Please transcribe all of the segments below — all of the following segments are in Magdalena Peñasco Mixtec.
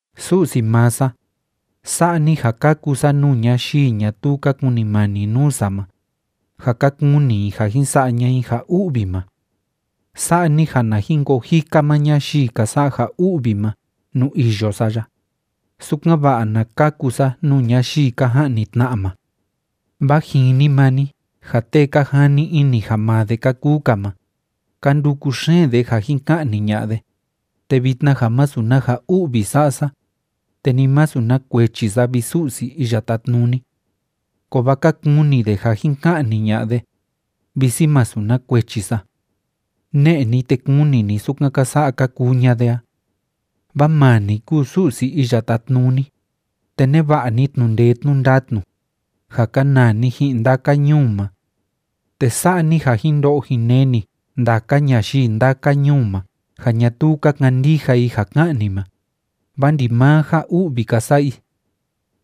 Su'si maa sa, sa'a ni ja kaku sa nuu ñayii ñatuu ka kunimani nuu sa ma, ja ka kúni i ja jin sa'a ña'a i ja u'vi ma. Sa'a ni ja na jin koo jika maa ñayii ka sa'a ja u'vi ma nuu iyo sa ya, sukan‑va'a na kaku sa nuu ñayii ka ja'ni tna'a ma. Vaa jini maa ni ja tee ka jani ini ja maa de ka kuu‑ka ma, ka nduku xeen de ja jin ka'ni ña'a de, te vitna ja masu na ja u'vi sa'a sa, te ni masu na kuechi sa, vi Su'si Iya Tátnuni. Kovaa ka kuni de ja jin ka'ni ña'a de, visi masu na kuechi sa. Ne'e ni, te kuni ni sukan ka sa'a ka kuu ña'a de a. Vaa maa ni kúu Su'si Iya Tátnuni, te neva'a ni tnu'u ndee tnu'u ndatnu, ja kanaa ni ji'in ndaka ñuu ma. Te sa'a ni ja jin ndo'o jin neni ndaka ñayii ndaka ñuu ma ja ñatuu ka kandija i ja ká'an ni ma, vaa ndimaa ja u'vi ka sa'a i.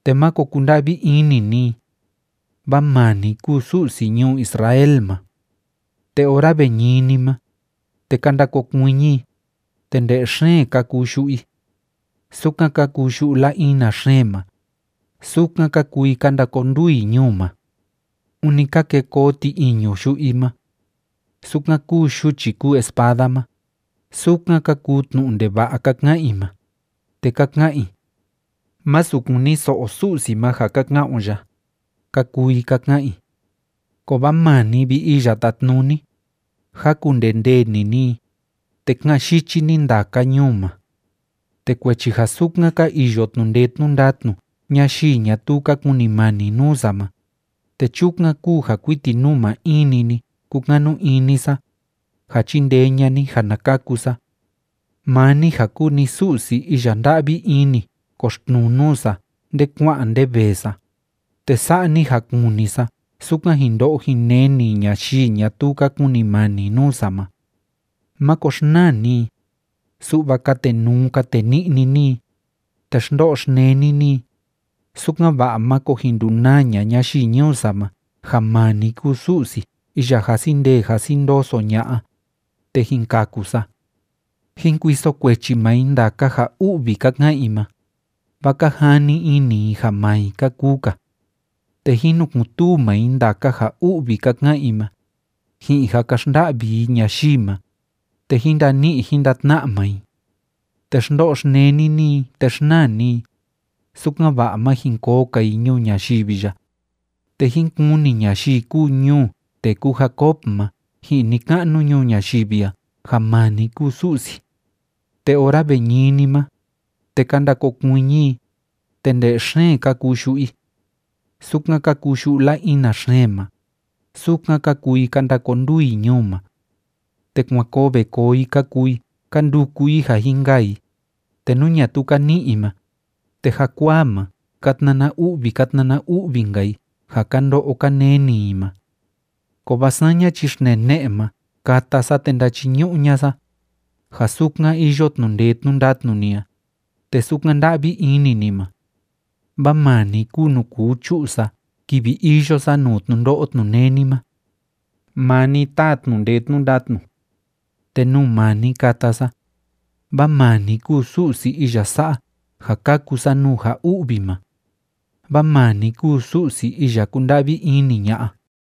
Te máko kunda'vi ini ni i, vaa maa ni kúu Su'si ñuu Israel ma. Te ora ve ñini ma, te ka ndakokuiñi i, te nde'e xeen ka kuu yu'u i. Sukan ka kuu yu'u la‑ina xeen ma, sukan ka kuu i ka ndakonduu i ñuu ma. Ûni ka ke koo ti‑iñu yu'u i ma. Sukan kúu yuchi kúu espada ma, sukan ka kuu tnu'u ndeva'a ka ka'an i ma, te ka ka'an i: “Másu kuniso'o Su'si ma ja ka ka'an o ya”, ka kuu i ka ka'an i. Kovaa maa ni, vi Iya Tátnuni, jákundee ndee‑ni ni i, te ká'an yichi ni ndaka ñuu ma. Te kuechi ja sukan ka iyo tnu'u ndee tnu'u ndatnu ñayii ñatuu ka kunimani nuu sa ma, te chukan kúu ja kuiti nuu maa in‑ni ni kúkanu ini sa, ja chindee ña'a ni ja na kaku sa. Maa ni ja kúu ni Su'si iya nda'vi ini koxtnuu nuu sa nde kua'an nde vee sa, te sa'a ni ja kuni sa sukan jin ndo'o jin neni ñayii ñatuu ka kunimani nuu sa ma. Máko xnaa ni i, su'va katenuu kateni'ni ni i, te xndo'o xneni ni i, sukan‑va'a máko jin ndunaa ña'a ñayii ñuu sa ma ja maa ni kúu Su'si iya jasi ndee jasi ndoso ña'a, te jin kaku sa. Jín kuiso kuechi maa i ndaka ja u'vi ka ka'an i ma, vaa ka jani ini i ja maa i ka kuu‑ka. Te jín nukun‑tuu maa i ndaka ja u'vi ka ka'an i ma, ji'in ja ka xnda'vi i ñayii ma, te jín ndani'i jín ndatna'a maa i. Te xndo'o xneni ni i, te xnaa ni i, sukan‑va'a má jin koo‑ka i ñuu ñayivi ya, te jín kuni ñayii kúu ñuu tee kúu Jacob ma ji'in ni‑ka'nu ñuu ñayivi a ja maa ni kúu Su'si. Te ora ve niñi ma, te ka ndakokuiñi i, te nde'e xeen ka kuu yu'u i. Sukan ka kuu yu'u la‑ina xeen ma, sukan ka kuu i ka ndakonduu i ñuu ma. Te kuan koo ve koo i ka kuu i ka nduku i ja jin kaa i, te nú ñatuu ka ni'i i ma, te jakuaa ma ka tnana u'vi ka tnana u'vi‑nka i ja ka ndo'o ka neni i ma. Kovaa saña chi xtnee ne'e ma kata sa te ndachiñu'u ña'a sa, ja sukan iyo tnu'u ndee tnu'u ndatnu ni a, te sukan nda'vi ini ni ma. Vaa maa ni kúu nuu kuu chu'u sa kivi iyo sa nuu tnundo'o tnuneni ma. Maa ni táa tnu'u ndee tnu'u ndatnu. Te nuu maa ni kata sa, vaa maa ni kúu Su'si iya sa'a ja kaku sa nuu ja u'vi ma. Vaa maa ni kúu Su'si iya kúnda'vi ini ña'a.